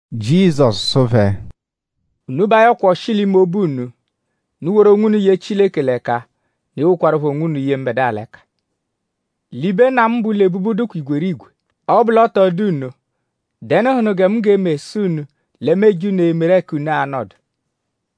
Jizọsu sụ phẹ: “Unu ba ayọkwa ọshi l'ime obu unu. Unu woru onwunu ye Chileke l'ẹka; unu ewokwarụpho onwunu ye mbẹdua l'ẹka. L'ibe Nna mu bẹ ụlo-ebubu dụkwa igwerigwe. Ọ -bụ l'ọ tọ dụ nno;?dẹnuhunu gẹ mu g'eme sụ unu lẹ mu eje unu emeru ẹka unu a-nọdu.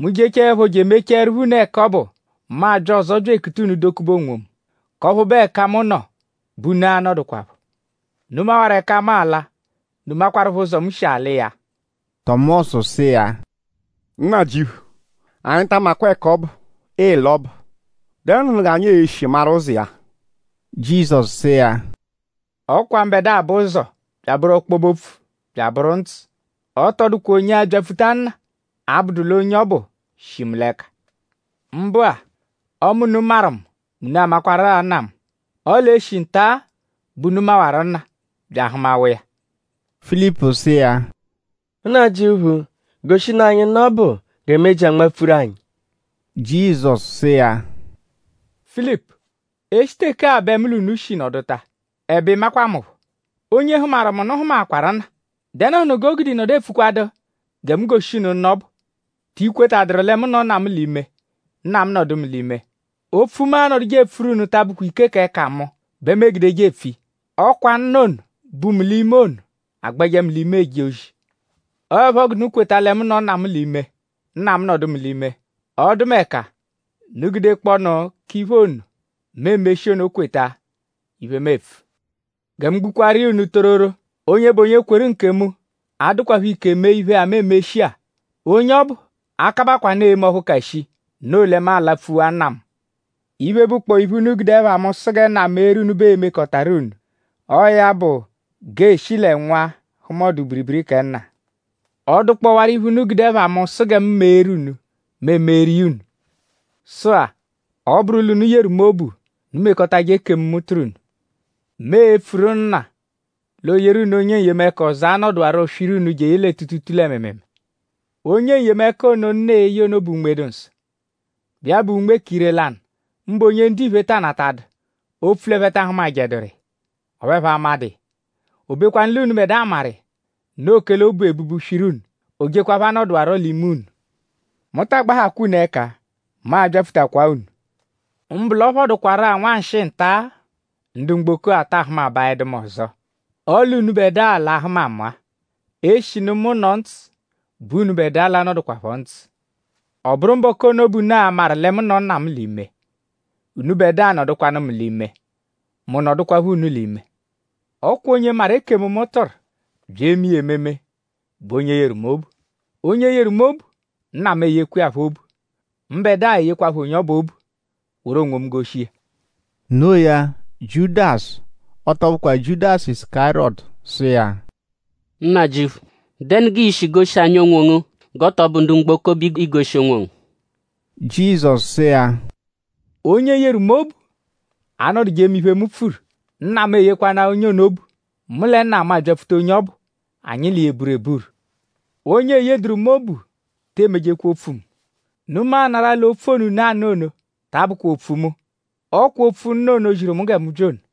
Mu -jechaẹpho je emechaẹrupho unu ẹka ọbu; mu abya ọzo bya ekuta unu dokube onwomu; k'ọphu bụ ẹka mu nọ bẹ unu a-nọdukwapho. Unu mawaru ẹka mu ala; unu makwarụpho ụzo, mu shi ala iya.” Tọmosu sụ iya: “Nnajịuphu; anyi ta amakwa ẹka ọbu, ịila ọbu.?Dẹnuhunu g'anyi shi maru ụzo iya?” Jizọsu sụ iya: “Ọ kwa mbẹdua bụ ụzo; bya abụru ọkpobe-opfu; bya abụru ndzụ. Ọ tọ dụkwa onye abyapfuta Nna; abụdu l'onye ọbu shi mu l'ẹka. Mbụ-a; ọme unu maru mu; mẹ unu amakwaru-a Nna mu. Ọle e -shi nta-a bẹ unu mawaru Nna bya ahụmawa iya.” Filipu sụ iya: “Nnajịuphu; goshinu anyi Nna ọbu gẹ meji anmapfuru anyi.” Jizọsu sụ iya: “Filipu; e -shi teke-a bẹ mu l'unu shi nọduta; ẹbe ị makwa mu phọ. Onye hụmaru mu nụ hụmaakwaru Nna.?Dẹnuhunu g'o gude ị nọdu epfukwadụ gẹ mu goshi unu Nna ọbu? ?Ti kwetadụru lẹ mu nọ Nna mu l'ime; Nna mu nọdu mu l'ime. Opfu, mu anọduje epfuru unu ta abụkwa ike k'ẹka mu bẹ mu egudeje epfu iya. Ọ kwa Nna ono, bu mu l'ime ono agbẹje mu l'ime eje ozi. Ọo ẹpho g'unu kweta lẹ mu nọ Nna mu l'ime; Nna mu nọdu mu l'ime; ọdumeka unu gudekpọonu k'iphe ono, mu emeshi ono kweta iphe, mu epfu.” Gẹ mu gbukwaaru iya unu tororo; onye bụ onye kweru nkemu a-dụkwapho ike mee iphe-a, mu emeshi-a. Onye ọbu a-kabakwaanụ eme ọphu ka shii. Noo lẹ mu alapfuwa Nna mu. Iphe, bụkpoo iphe, unu gude ẹpha mu sụ gẹ Nna meeru unu bẹ mu e-mekọtaru unu. Ọo ya bụ; g'eeshi lẹ Nwa hụma ọdu-biribiri kẹ Nna. Ọ -dụkpowaru iphe, unu gude ẹpha mu sụ gẹ mu meeru unu; mu emeeru iya unu. “Sụ-a; ọ -bụru l'unu yeru mu obu; unu mekọtaje ekemu, mu tụru unu. Mu e-pfuru Nna l'ooyeru unu onye N-yemẹka ọzo, a-nọduwaro swiru unu jeye lẹ tuutuutuu lẹ mịimiimii. Onye N-yemẹka ono, Nna e-ye ono bụ Unme-dụ-Nsọ, bụ iya bụ Unme k'ire-lanụ; mbụ onye ndiphe taa natadụ; opfu l'ẹphe ta ahụmajeduru iya; ọphu ẹphe amadụ iya. O bekwanụ l'unubẹdua maru iya. Noo kẹle o bu ebubu swiru unu. O jekwaphọ anọduwaro l'ime unu.” “Mu taa gbahakwa unu ẹka. Mu a-byapfutakwa-a unu. Mbụ l'ọ phọdukwaru-a nwanshịi nta-a; ndu mgboko-a taa hụmabaedu mu ọzo; ọle unubẹdua l'a-hụma mu-a. Eshinu mu nọ ndzụ bẹ unubẹdua l'a-nọdukwapho ndzụ. Ọ bụru mbọku ono bẹ unu a-maru lẹ mu nọ Nna mu l'ime; unubẹdua nọdukwanu mu l'ime; mu nọdukwapho unu l'ime.” “Ọ kwa onye maru ekemu, mu tụru bya eme iya ememe bụ onye yeru mu obu. Onye yeru mu obu; Nna mu eyekwa iya phọ obu. Mbẹdua eyekwaphọ onye ọbu obu; woru onwomu goshi iya.” No iya Jiudasu; ọ tọ bụkwa Jiudasu Isukariyọtu; sụ iya: “Nnajịuphu;?dẹnu g'ii-shi goshi anyi onwongu g'ọ tọ bụ ndu mgboko bẹ iigoshi onwongu?” Jizọsu sụ iya: “Onye yeru mu obu anọduje eme iphe, mu pfuru. Nna mu eyekwanaa onye ono obu. Mu lẹ Nna mu a-byapfuta onye ọbu; anyi l'iya eburu eburu. Onye eyeduru mu obu te emejekwa opfu mu. Unu maanarụ-a l'opfu ono, unu anụ ono ta abụkwa opfu mu. Ọ kwa opfu Nna ono, ziru mu gẹ mu bya ono.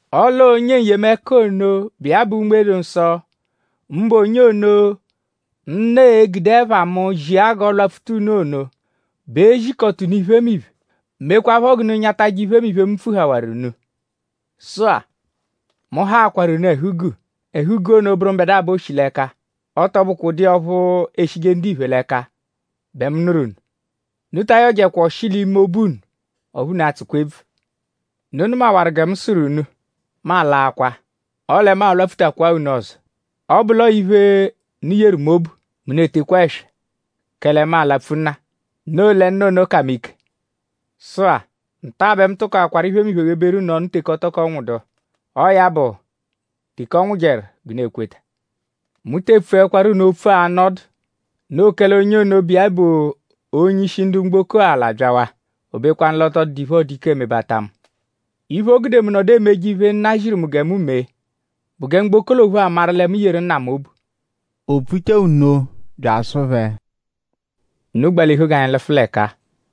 Ọle ọo onye N-yemẹka ono, bụ iya bụ Unme-dụ-Nsọ; mbụ onye ono, Nna e-gude ẹpha mu zia g'ọ lwapfuta unu ono bẹ e-zikọta unu iphemiphe; mekwaphọ g'unu nyatajẹ iphemiphe, mu pfuhawaru unu. “Sụ-a; mu haakwaru unu ẹhu-guu. Ẹhu-guu ono bụru mbẹdua bẹ o shi l'ẹka; ọ tọ bụkwa ụdu iya ọphu eshije ndiphe l'ẹka bẹ mu nụru unu. Unu ta ayọjekwa ọshi l'ime obu unu; ọphu unu atsụkwa ebvu. Unu nụmawaru gẹ mu sụru unu: ‘Mu alaakwa; ọle mu a-lwapfutakwaa unu ọzo.’ Ọ -bụ l'ọo iphe, unu yeru mu obu mẹ unu etekwaa ẹswa; kẹle mu alapfu Nna; noo lẹ Nna ono ka mu ike. Sụ-a; nta-a bẹ mu tụkoakwaru iphemiphe gheberu unu ọnu teke ọ tọko nwụdu. Ọo ya bụ; teke ọ nwụjeru g'unu e-kweta. Mu te epfuẹkwaru unu opfu anọ ọdu; noo kẹle onye ono, bụ iya bụ onye-ishi ndu mgboko-a l'abyawaa. O bekwanụ l'ọ tọ dụdu iphe, ọo-dụ ike emebata mu. Iphe, o gude mu nọdu emeje iphe, Nna ziru mu gẹ mu mee bụ gẹ mgboko l'ophu amaru lẹ mu yeru Nna mu obu.” O pfuchaa nno bya asụ phẹ: “Unu gbalihu g'anyi lụfu l'ẹka-a.”